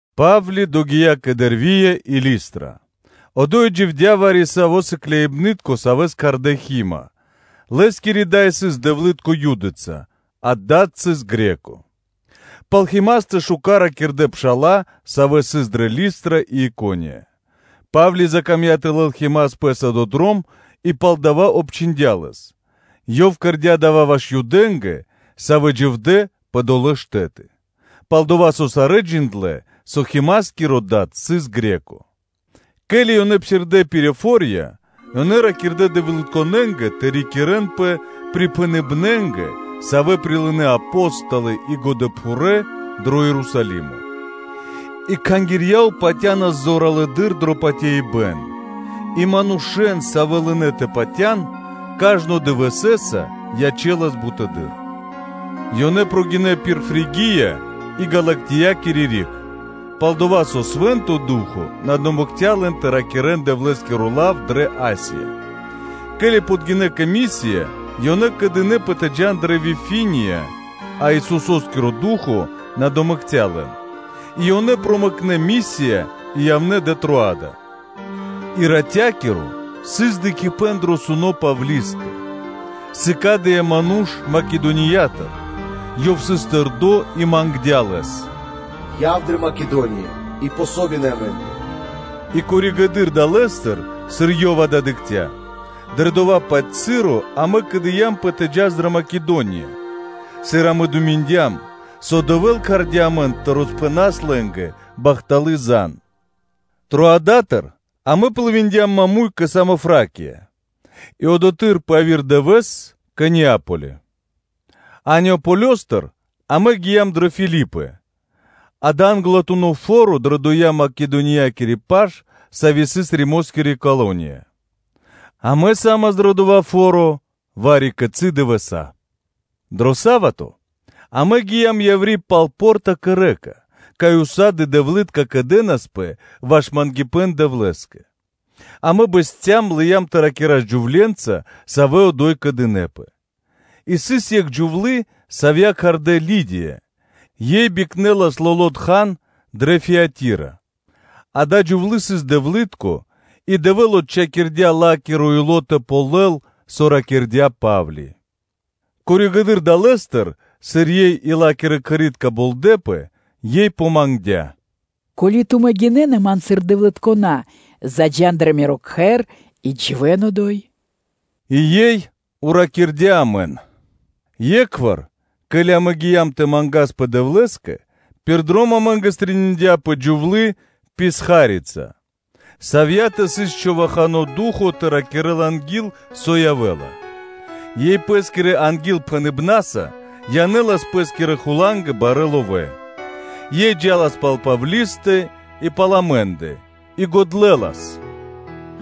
Па́вли догия́ кэ Дэрвия и Листра: одо́й дживдя́ вари-саво́ сыкляибны́тко, савэ́с кхардэ́ Хима (Тимофеё), лэ́скири дай сыс дэвлы́тко Юдыца, а дад сыс Гре́ко (Баламо́), пал Химастэ шука́р ракирдэ́ пша́ла, савэ́ сыс дрэ Листра и Икония. Па́вли закамдя́ тэ лэл Химас пэ́са дро дром, и палдава́ обчхиндя лэс, ёв кэрдя́ дава́ ваш Юдэ́нгэ, савэ́ дживдэ́ пэ долэ́ штэ́ты, пал-дова́ со сарэ́ джиндлэ́, со Химаскиро дад сыс Гре́ко (Баламо́). Ке́ли ёнэ псирдэ́ пир фо́рья, ёнэ ракирдэ́ дэвлытконэнгэ тэ рикирэнпэ припхэныбнэнгэ, савэ́ прилынэ́ Апо́столы и годэпхурэ́ дро Ерусалимо. И кхангирья ячэнас зоралэды́р дро патяибэ́н и манушэ́н, савэ́ лынэ́ тэ патя́н кажнонэ́ дывэсэса, ячэлас бутэды́р. Ёнэ гинэ́ пир Фригия и Галатиякири риг, пал-дова́ со Свэ́нто Ду́хо (Фа́но) на домэкця лэн тэ ракирэ́н Дэвлэ́скиро лав дрэ Асия. Ке́ли подгинэ́ кэ Мисия, ёнэ кэдынэпэ тэ джа́н дрэ Вифиния, а Исусо́скиро Ду́хо (Фа́но) на домэкця лэн, и ёнэ промэкнэ Мисия и явнэ́ дрэ Троада. И ратя́киро сыс дыкхибэ́н дро сунэ́ Павлискэ: сыкадыя́ ману́ш Македониятыр, ёв сыс тэрдо́ и мангдя́ лэс: “Яв дрэ Македония и помогин (дэ́ васт) амэ́нгэ.” И коригэды́р далэ́стыр, сыр ёв дава́ дыкхця́, дрэ дова́-паць часо амэ кэдыямпэ тэ джас дрэ Македония, сыр амэ думиндям, со Дэвэ́л кхардя́ амэн тэ роспхэнас лэ́нгэ бахталы́ зан (звесь). Троадатыр амэ плывиндям (дыя́м пли́ма) маму́й кэ Самофракия, и одотхы́р пэ яви́р дывэ́с кэ Неаполё, а Неаполёстыр амэ гиям дрэ Филипы: дава́ англатуно́ фо́ро дрэ доя́ Македониякири паш, саво́ сыс Римоскири колония. Амэ са́мас дро дава́ фо́ро вари-кицы́ дывэса́. Дро са́вато (субо́та) амэ гиям яври́ пал по́рта кэ рэка (лэнь), кай усады (сак) дэвлы́тка кэдэнаспэ ваш мангипэ́н Дэвлэ́скэ; амэ бэсцям и лыям тэ ракирас джувле́нца, савэ́ одо́й кэдынэпэ. И сыс екх джувлы́, савья́ кхардэ́ Лидия, ёй бикнэлас лоло́ тхан (материя) дрэ Фиатира, ада́я джувлы́ сыс дэвлы́тко, и Дэвэ́л отчхакирдя́ ла́киро ило́ тэ ґалёл, со ракирдя́ Па́вли. Пало́ (после) дава́, сыр ёй и ла́кирэ кхэри́тка болдэпэ, ёй помангдя: “Ко́ли тумэ́ гинэ́на ман сыр дэвлыткона, то заджа́н дрэ миро кхэр и дживэ́н одо́й.” И ёй уракирдя амэн. Екхвар, ке́ли амэ гиям тэ мангаспэ Дэвлэ́скэ, пир дром амэ́нгэ стрэниндяпэ джувлы́-писхарица, савьятэ сыс човахано ду́хо (фа́но) тэ ракирэ́л анги́л, со явэ́ла, ёй пэ́скирэ ангилпхэныбнаса янэлас пэ́скирэ хулангэ барэ́ ловэ́. Ёй джа́лас пал Павлистэ и пал амэ́ндэ, и годлэлас: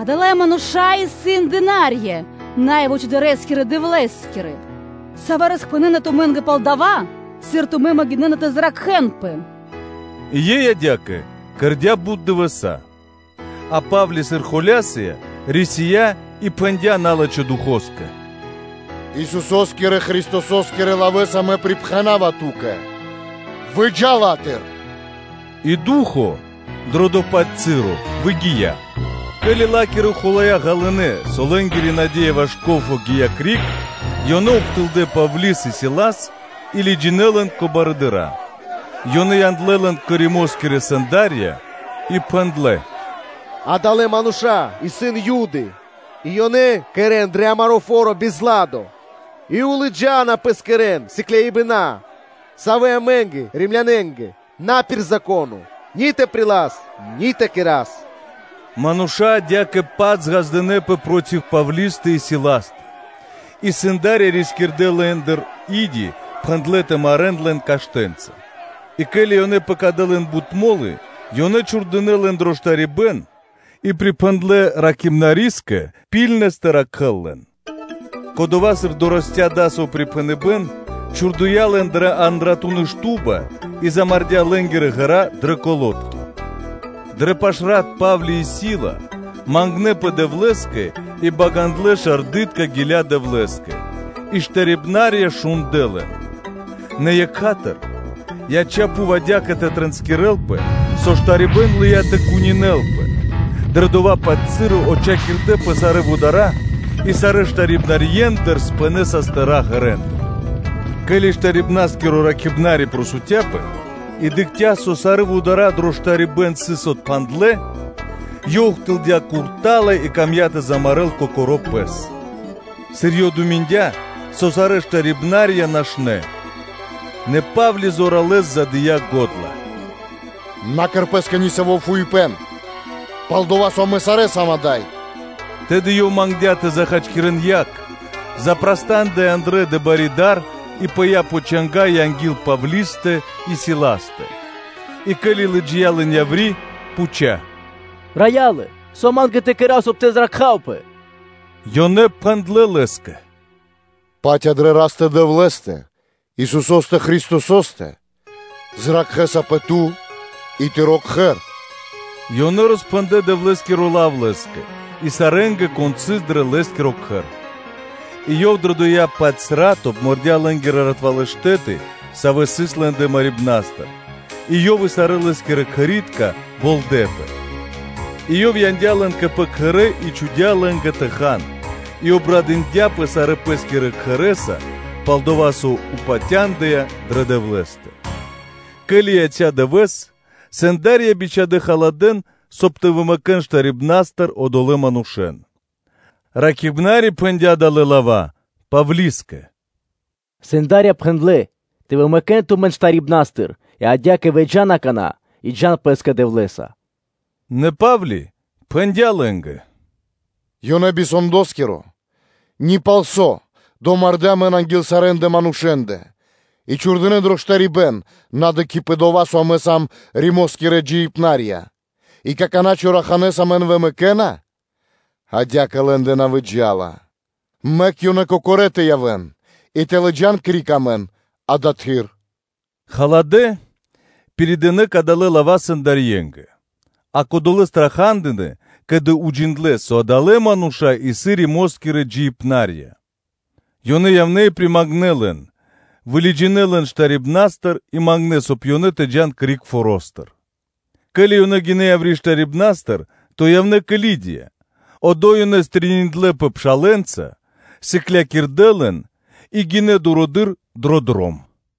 “Адалэ́ мануша́ исын дына́рья Най Вучыдырэскирэ Дэвлэ́скирэ, савэ́ роспхэнэна тумэ́нгэ пал дова́, сыр тумэ́ могинэ́на тэ зракхэнпэ.” И ёй адя́кэ кэрдя́ бут дывэса́. А Па́вли, сыр холя́сыя, рисия́ и пхэндя́ налачхэ́ духоскэ: “Исусо́скирэ Христосо́скирэ лавэ́са Мэ припхэнава ту́кэ: выджа ла́тыр.” И ду́хо (фа́но) дро дова́-паць часо выгия́. Ке́ли ла́кирэ хулая́ ґалынэ́, со лэ́нгири наде́я ваш ко́фо (прибыль) гия́ криг, ёнэ ухтылдэ́ Павли́с и Силас и лыджинэ́ лэн пэ форуны́ (пло́шча) кэ барыдыра́; ёнэ яндлэ́ лэн кэ Римо́скирэ сэнда́рья и пхэндлэ́: “Адалэ́ мануша́ исын Юды, и ёнэ кэрэ́на дро амаро́ фо́ро бизладо (беспорядко), и лыджа́на пэ́са пэ́скирэ сыкляибэна, савэ́ амэ́нгэ Римлянэнгэ на пир Зако́но ни тэ прилас, ни тэ кэра́с.” Мануша́ адя́кэ-паць ґаздынэ́пэ проти Павлистэ и Силастэ; и сэнда́рья рискирдэ́ лэ́ндыр и́ди, пхэндлэ́ тэ марэ́н лэн каштэнца. И ке́ли ёнэ пэкадэ лэн бут мо́лы, ёнэ чхурдынэ́ лэн дро штарибэ́н, и припхэндлэ ракхибнарискэ ракхунэс тэ ракхэ́л лэн: кодова́, сыр дорэсця́ дасаво припхэныбэ́н, чхурдыя́ лэн дрэ андратуны́ шту́ба и замардя́ лэ́нгирэ ґэра́ дрэ калодки. Дрэ пашрат Па́вли и Сила мангнэпэ Дэвлэ́скэ и багандлэ шардытка гиля́ Дэвлэ́скэ, и штарибнарья шундлэ́ лэн. Нэ екха́тыр (сра́зу) яця́ пхув адя́кэ тэ тринскирэлпэ, со штарибэ́н лыя́ тэ кунинэлпэ; дрэ дова́-паць часо отчхакирдэпэ сарэ́ вудара́, и сарэ́ штарибнарьендэ пынэ (тэлэ́) састыра́ ґэрэндыр. Ке́ли штарибнаскиро ракхибнари джанга́дыя и дыкхця́, со сарэ́ вудара́ дро штарибэ́н сыс отпхандлэ (псирадэ́), ёв ухтылдя курта́ла и камдя́ тэ замарэ́л кокоро́ пэс, сыр ёв думиндя, со сарэ́ штарибнарья нашнэ́. Нэ Па́вли зоралэ́с задыя го́дла: “На кэр пэ́скэ нисаво́ фуипэ́н, пал-дова́ со амэ сам сарэ́ ада́й.” Тэды ёв мангдя́ тэ захачкирэн яг, запрастандыя андрэ́ дрэ бари дар и пыя́ пэ чанга́ анги́л Павлистэ и Силастэ. И ке́ли лыджия́ лэн яври́, пхуця́: “Рая́лэ! Со ма́нгэ тэ кэра́в, соб (кай) тэ зракхавпэ?” Ёнэ пхэндлэ́ лэ́скэ: “Патя дрэ Растэ-Дэвлэ́стэ, Исусо́стэ Христосо́стэ, зракхэсапэ ту и тыро́ кхэр.” И ёнэ роспхэндлэ́ Дэвлэ́скиро лав лэ́скэ и сарэ́нгэ, кон сыс дро лэ́скиро кхэр. И ёв дрэ доя́-паць рат обмордя лэ́нгэ ратвалэ́ штэ́ты, савэ́ сыс лэ́ндэ марибнастыр, и ёв и сарэ́ лэ́скирэ кхэри́тка болдэпэ. И ёв яндя́ лэн кэ пэ кхэрэ́, и чхудя́ лэ́нгэ тэ хан и обрадындяпэ сарэ́ пэ́скирэ кхэрэса пал дова́, со патяндыя дрэ Дэвлэ́стэ. Ке́ли яця́ дывэ́с, сэнда́рья бичхадэ́ провинцыякирэ барэ́ ран, соб (кай) тэ вымэкэн штарибнастыр одолэ́н манушэ́н. Ракхибнари пхэндя́ далэ́ лава́ Павлискэ: “Сэндарья пхэндлэ́ тэ вымэкэн тумэн штарибнастыр: и адя́кэ, выджа́н какана́ и джа́н пэ́скэ Дэвлэ́са.” Нэ Па́вли пхэндя́ лэ́нгэ: “Ёнэ би сэндоскиро ни пал со домардэ́ амэн анги́л сарэ́ндэ манушэ́ндэ и чхурдынэ́ дро штарибэ́н, на дыкхи́ пэ дова́, со амэ сам Римо́скирэ джиибна́рья, и какана́ чораханэ́с амэн вымэкэна? Адя́кэ лэ́ндэ на выджа́ла! Мэк ёнэ кокорэ́ тэ явэ́н и тэ лыджа́н криг амэн адатхы́р.” Халадэ́ пиридынэ кадалэ́ лава́ сэндарьенгэ, и кодолэ́ страха́дынэ, ке́ли уджиндлэ́, со адалэ́ мануша́ исын Римо́скирэ джиибна́рья. Ёнэ явнэ́ и примангнэ лэн, вылыджинэ́ лэн штарибнастыр, и мангнэ́, соб (кай) ёнэ тэ джа́н криг форо́стыр. Ке́ли ёнэ гинэ́ яври́ штарибнастыр, то явнэ́ кэ Лидия, одо́й ёнэ стрэниндлэпэ (дыкхнэпэ) пшалэ́нца, сыклякирдэ́ лэн и гинэ́ дурыдыр дро дром.